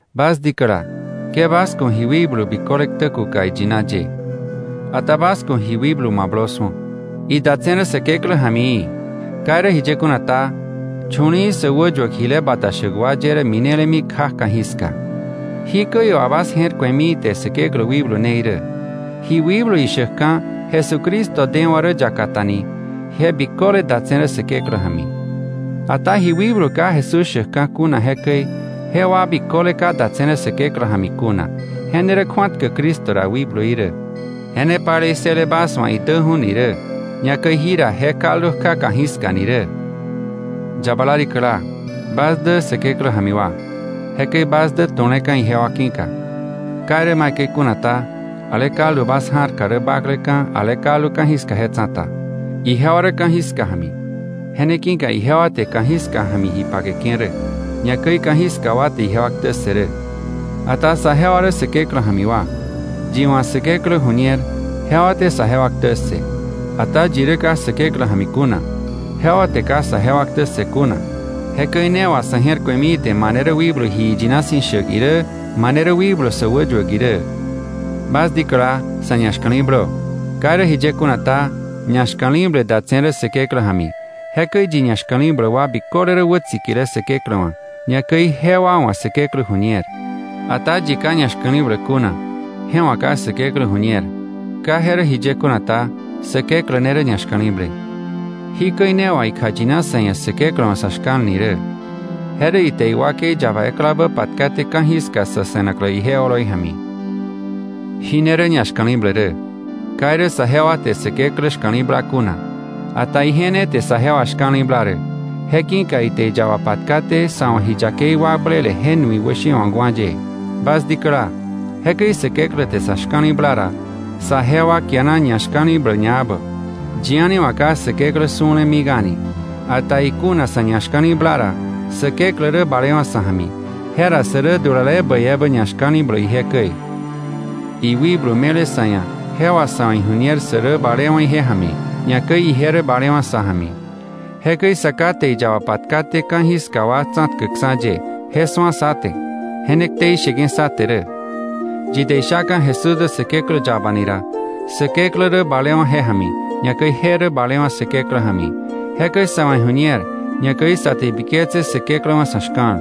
Bas dikäla, ke bas ku̱ ji wikblu biköle ktä kuka iyina ye. Ata bas ku̱ ji wikblu mablö su̱o, idatse̱ rä Säkeklä ja̱mi í̱. Ka irä jiye kuna ta, chu̱li̱i̱ sä wäyuäk jile bata shäk wa ye rä minelemi kja ka̱jiska. Jikäi wà bas je̱r ku̱emi ite Säkeklä wikblu ne irä: Ji wikblu ishäkka̱ Jesucristo dewa̱ rä yaka ta ni, je biköle datse̱ rä Säkeklä ja̱mi. Ata ji wikblu ka Jesús shäkka̱ kuna jekäi, jewa biköle ka datse̱ rä Säkeklä ja̱mi kuna. Je ne rä kju̱atkäk Cristo ra wikbluí rä. Je ne palei ssële bas wa̱ idäju̱ ni rä, ñakäi jira je kaldu kja ka̱jiska ni rä. Yabala rikäla, bas dä Säkeklä ja̱mi wa. Jekäi bas dä tu̱leka̱ ijewa ki̱ka. Ka irä maikäi kuna ta, ale kaldu bas ja̱rka rä bakleka̱, ale kaldu ka̱jiska je tsa̱ta. Ijewa rä ka̱jiska ja̱mi. Je ne ki̱ka ijewa te ka̱jiska ja̱mi ji pakeke̱ rä, ñakäi ka̱jiska wa te ijewa ktä ssë rä. Ata saje wa rä Säkeklä ja̱mi wa. Yi wa̱ Säkeklä ju̱ñer, jewa te saje wa ktä ssë. Ata yi rä ka Säkeklä ja̱mi kuna, jewa te ka saje wa ktä ssë kuna. Je käi ne wà sa̱ je̱r ku̱emi ite mane rä wikblu ji yina si̱ shäk irä, mane rä wikblu sä wäyuäk irä. Bas dikäla, sa̱ ñashka̱li̱blö. Ka irä jiye kuna ta, ñashka̱li̱ble datse̱ rä Säkeklä ja̱mi. Jekäi yi ñashka̱li̱bläk wa biköle rä wätsikile Säkeklä wa̱, ñakäi jewa wa̱ Säkeklä ju̱ñer. Ata yi ka ñashka̱li̱bläk kuna, je wa̱ ka Säkeklä ju̱ñer. Ka je rä jiye kuna ta, Säkeklä ne rä ñashka̱li̱ble. Jí käi ne wà ikjayina sa̱ ia̱ Säkeklä wa̱ sa̱ shka̱l ni rä: Je rä ite iwakei yaba eklabä patkaté ka̱jiska sä se̱naklä ije oloi ja̱mi. Jí ne rä ñashka̱li̱ble rä: Ka irä saje wa te Säkeklä shka̱li̱bla kuna, ata ije ne te saje wa shka̱li̱bla rä, je ki̱ka ite iyaba patkaté sa̱ wa̱ ji yakei wakblele je nui wäshewa̱kwa̱ ye. Bas dikäla, jekäi Säkeklä te sa̱ shka̱li̱bla ra, saje wa kiana ñashka̱li̱bläk ñaebä. Yi a̱ni wa̱ ka Säkeklä su̱le mik a̱ni. Ata ikuna sa̱ ñashka̱li̱bla ra, Säkeklä rä balewa̱ sa̱ ja̱mi, je ra sä rä dulale bäi ebä ñashka̱li̱bläk ije käi. Iwikblu me̱le sa̱ ia̱, je wà sa̱ wa̱ iju̱ñer sä rä balewa̱ ije ja̱mi, ñakäi ije rä balewa̱ sa̱ ja̱mi. Jekäi Sa Ká te iyaba patkaté ka̱jiska wa tsa̱tkäkksa̱ ye, je su̱a sá te, je ne ktei sheke̱ sá te rä. Yi te ishaka̱ Jesús dä Säkeklä yaba ni ra, Säkeklä rä balewa̱ je ja̱mi, ñakäi je rä balewa̱ Säkeklä ja̱mi. Jekäi sa̱ wa̱ iju̱ñer, ñakäi sa te ibiketse Säkeklä wa̱ sa̱ shka̱l.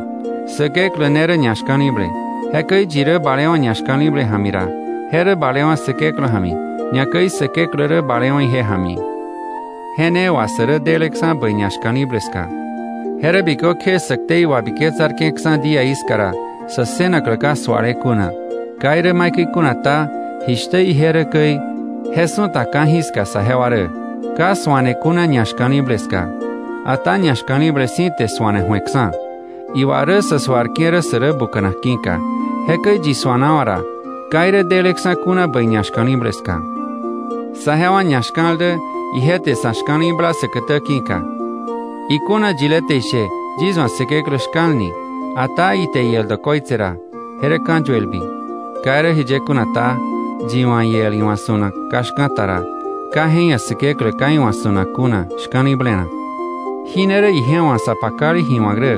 Säkeklä ne rä ñashka̱li̱ble. Jekäi yi rä balewa̱ ñashka̱li̱ble ja̱mi ra, je rä balewa̱ Säkeklä ja̱mi, ñakäi Säkeklä rä balewa̱ ije ja̱mi. Je ne wà sä rä deleksa̱ bäi ñashka̱li̱ble ska. Je rä bikökje sä ktei wabiketsarke̱ksa̱ díaí ska ra, sä ssënaklä ka suale kuna. Ka irä maikäi kuna ta, jishtä ije rä käi, je su̱ta ka̱jiska saje wa rä. Ka suane kuna ñashka̱li̱ble ska. Ata ñashka̱li̱ble si̱ te su̱ane ju̱eksa̱. Iwa rä sa suarke̱ rä, sä rä buka̱nak ki̱ka. Jekäi yi suanawa̱ ra, ka irä deleksa̱ kuna bäi ñashka̱li̱ble ska. Saje wa ñashka̱l dä, ije te sa̱ shka̱li̱bla säkätä ki̱ka. Ikuna yile te ishe, yis wa̱ Säkeklä shka̱l ni, ata ite iel dokoitse ra, je rä ka̱yuelbi. Ka irä jiye kuna ta, yi wa̱ iel iwa̱ su̱nak ka shka̱ta ra, ka je ia̱ Säkeklä ka iwa̱ su̱nak kuna shka̱li̱blenak. Jí ne rä ije wa̱ sa pakale ji wa̱k rä: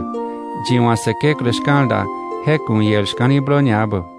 Yi wa̱ Säkeklä shka̱l da, je ku̱ iel shka̱li̱blö ñaebä.